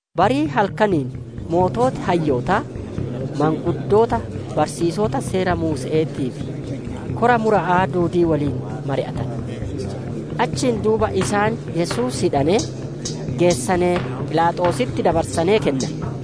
Barii halkaniin sooreyyiin hayyootaa: maanguddoota, barsiisota Seera Muuse'eetii fi kora mura'aa duudii woliin mari'atane. Achiin duuba isaan Yesuus hidhanee, geessanee, Philaaxoositti dabarsanee kennane.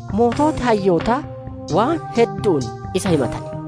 Sooreyyiin hayyootaa waan heddu'uun isa himatane.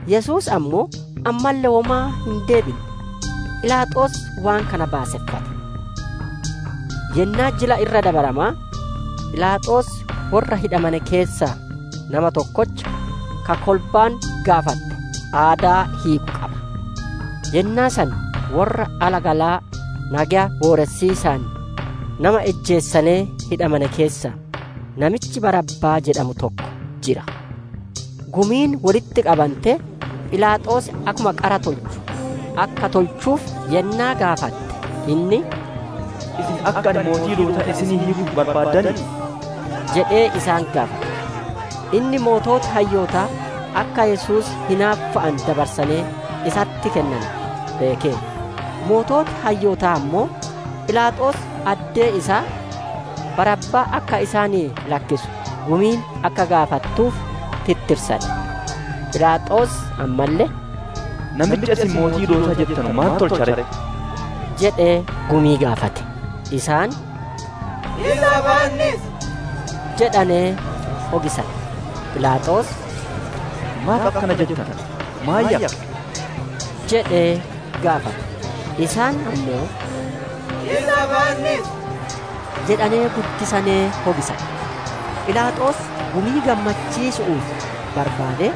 Yesuus ammoo, ammalle womaa hin deebinne; Philaaxoos waan kana baaseffate. Yennaa Jila Irra Dabaramaa, Philaaxoos worra hidhamane keessaa nama tokkocha, ka kolbaan gaafatte aadaa hiiku qaba. Yennaa san worra alagalaa nageya booressiisaan nama ijjeesanee hidhamane keessaa namichi Barabbaa jedhamu tokko jira. Gumiin wolitti qabantee, Philaaxoos akkuma qara tolchu akka tolchuuf yennaa gaafatte, inni, «Isin akka ani mootii Yihudootaa isinii hiikuuf barbaaddanii?» jedhee isaan gaafate. Inni sooreyyiin hayyootaa akka Yesuus hinaaffa'aan dabarsanee isatti kennane beekeera. Sooreyyiin hayyootaa ammoo, Philaaxoos addee isaa Barabbaa akka isaanii lakkisu gumiin akka gaafattuuf tirtirsane. Philaaxoos ammalle, «Namicha isin Mootii Yihudootaa jettanu maan tolcha ree?» jedhee gumii gaafate. Isaan, «Isa fannisi!» jedhanee hogisane. Philaaxoos, «Maaf akkana jettan? Maan yakke?» jedhee gaafate. Isaan ammoo, «Isa fannisi!» jedhanee guddisanee hogisane. Philaaxoos gumii gammachiisu'uuf barbaadee,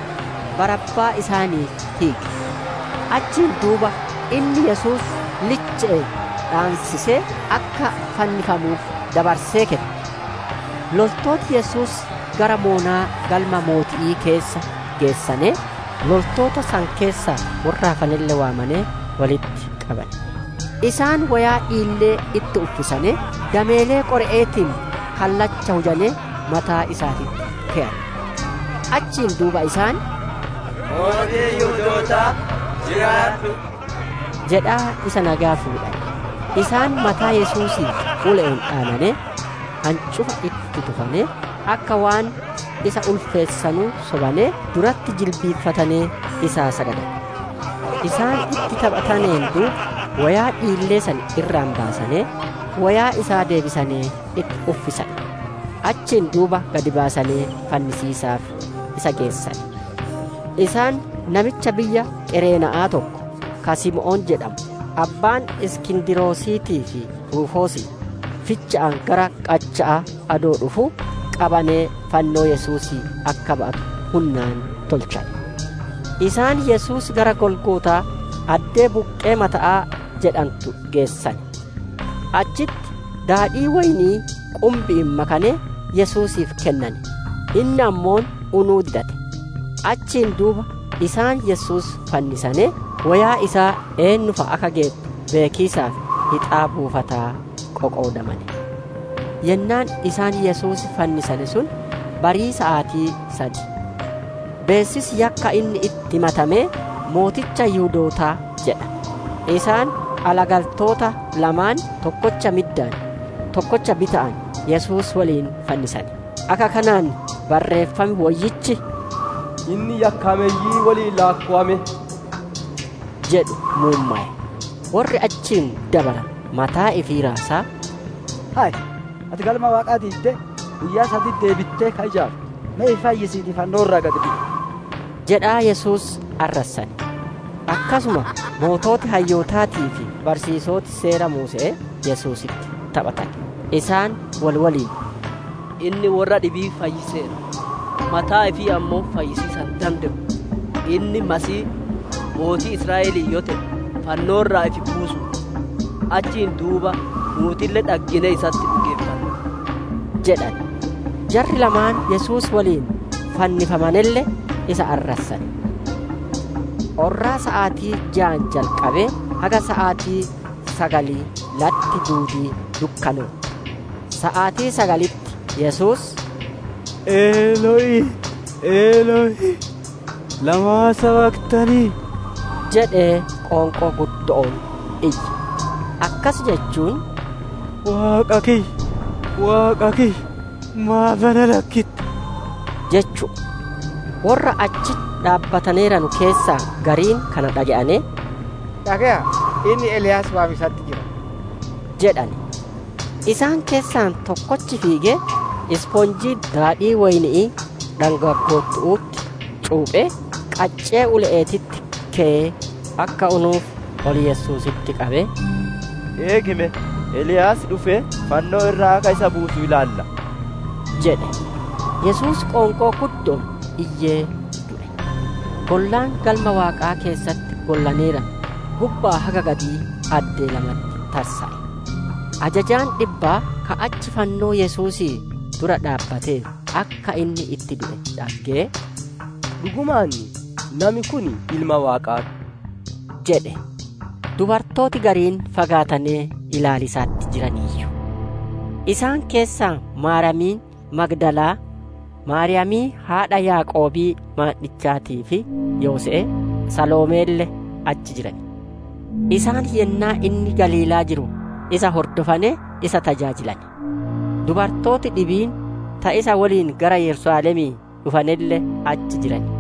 Barabbaa isaaniif hiike. Achiin duuba inni Yesuus liche'een dhaansisee akka fannifamuuf dabarsee kenne. Loltooti Yesuus gara moonaa galma mooti'ii keessa geessanee, loltoota san keessaa worra hafanelle waamanee wolitti qabane. Isaan woyaa dhiillee itti uffisane, dameelee qore'eetiin kallacha hujanee mataa isaatitti keyane. Achiin duuba isaan, «Mootii Yihudootaa jiraadhu!» jedhaa isa nageya fuudhane. Isaan mataa Yesuusii ule'een dhaananee, hancufa itti tufanee, akka waan isa ulfeessanuu sobanee duratti jilbiiffatanee, isaa sagadane. Isaan itti taphataneen duuba woyaa dhiillee san irraa baasanee, woyaa isaa deebisanee itti uffisane. Achiin duuba gad baasanee fannisiisaaf isa geessane. Isaan namicha biyya Qareena'aa tokko, ka Simoon jedhamu, abbaan Iskindrosiitii fi Ruufoosii, ficha'aa gara qacha'aa adoo dhufuu qabanee fannoo Yesuusii akka ba'atu hunnaan tolchane. Isaan Yesuus gara Golgootaa, addee «Buqqii mata'aa» jedhantu geessane. Achitti daadhii woyni'ii qumbi'iin makanee Yesuusiif kennane; inni ammoo unuu didate. Achiin duuba isaan Yesuus fannisanee, woyaa isaa eennu fa'a akka geettu beekiisaaf hixaa buufataa qoqoodamane. Yennaan isaan Yesuus fannisane sun barii saatii sad. Beessisi yakkaa inni itti himatamee, «Mooticha Yihudootaa» jedha. Isaan alagaltoota lamaan, tokkocha middaan, tokkocha bita'aan Yesuus woliin fannisane. [ Akka kanaan Barreeffam Woyyichi, «Inni yakkaameyyii woliin laakkowame» jedhu muummowe.] Worri achiin dabaranu, mataa ifi raasaa, «Hay! Ati Galma Waaqaa diiddee guyyaa saditti deebittee ka ijaartu! Me ifi fayyisiitii fannoo irraa gad bu'i!» jedhaa Yesuus arrassane. Akkasuma sooreyyiin hayyootaatii fi barsiisoti Seera Muuse'ee Yesuusitti taphatane. Isaan wol woliin, «Inni worra dhibii fayyiseera, mataa ifii ammoo fayyisiisa hin dande'u! Inni Masiihii, Mootii Israa'el yoo te'e, fannoo irraa ifi buusuu ti! Achiin duuba nuutille dhagginee isatti dhugeeffanna!» jedhane. Jarri lamaan Yesuus woliin fannifamanelle isa arrassane. Orraa saatii jaan jalqabee, haga saatii sagalii latti duudiin dukkanootte. Saatii sagalitti Yesuus, «Elo'ii, Elo'ii, lamaa sabaktanii?» jedhee qoonqoo guddo'oon iyye; akkas jechuun, «Waaqa Kiyya, Waaqa Kiyya, maaf na lakkittee?» jechu'u. Worra achi dhaabbataneeranu keessaa gariin kana dhage'anee, «Dhage'aa, inni Eliyaas waamiisatti jira» jedhane. Isaan keessaa tokkochi fiigee, ispoonjii daadhii woyni'ii dhangaggoottu'utti cuuphee, qaccee ule'eetitti keyee, akka unuuf ol Yesuusitti qabee, «Eegi me! Eliyaas dhufee fannoo irraa akka isa buusu ilaallaa!» jedhe. Yesuus qoonqoo guddo'oon iyyee du'e. Gollaan Galma Waaqaa keessatti gollaneeranu gubbaa haga gadii addee lamatti tarsa'e. Ajajaan dhibbaa, ka achi fannoo Yesuusii dura dhaabbateeru, akka inni itti du'e dhage'ee, «Dhugumaan, nami kun Ilma Waaqaa ti» jedhe. Dubartooti gariin fagaatanee ilaaliisatti jiraniiyyu. Isaan keessaa Maaryamii Magdalaa, Maaryamii haadha Yaaqoobii maandhichaatii fi Yoose'ee, Saloomeelle achi jiran. Isaan yennaa inni Galiilaa jiru isa hordofanee, isa tajaajilane. Dubartooti dhibiin ta isa woliin gara Yerusaalemii dhufanelle achi jiran.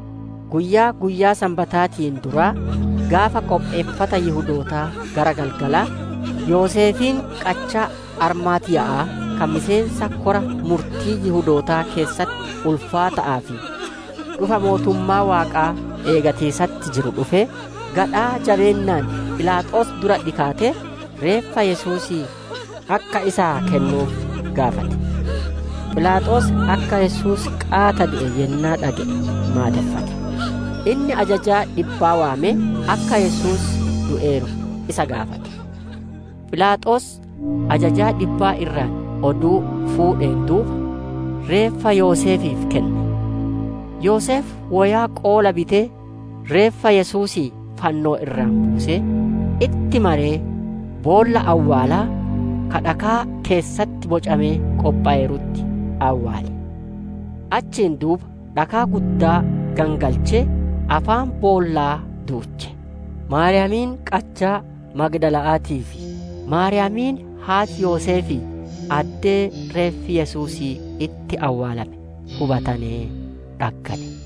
Guyyaa, guyyaa Sanbataatiin duraa, gaafa qopheeffata Yihudootaa gara galgalaa, Yoseefiin qachaa Armaatiya'aa ka miseensa kora murtii Yihudootaa keessatti ulfaata'aa fi dhufa mootummaa Waaqaa eegatiisatti jiru dhufee, gadhaa jabeennaan Philaaxoos dura dhikaatee reeffa Yesuusii akka isaa kennuuf gaafate. Philaaxoos akka Yesuus qaata du'e yennaa dhage'ee maadeffate. Inni ajajaa dhibbaa waamee akka Yesuus du'eeru isa gaafate. Philaaxoos ajajaa dhibbaa irraa oduu fuudheen duuba, reeffa Yoseefiif kenne. Yoseef woyaa qoola bitee reeffa Yesuusii fannoo irraa buusee, itti maree, boolla awwaalaa ka dhakaa keessatti bocamee qophoweerutti awwaale. Achiin duuba dhakaa guddaa gangalchee afaan boollaa duuche. Maariyaamiin qachaa Magdala'aatii fi Maariyaamiin haati Yoseefii addee reeffi Yesuusii itti awwaalame hubatanee dhaggane.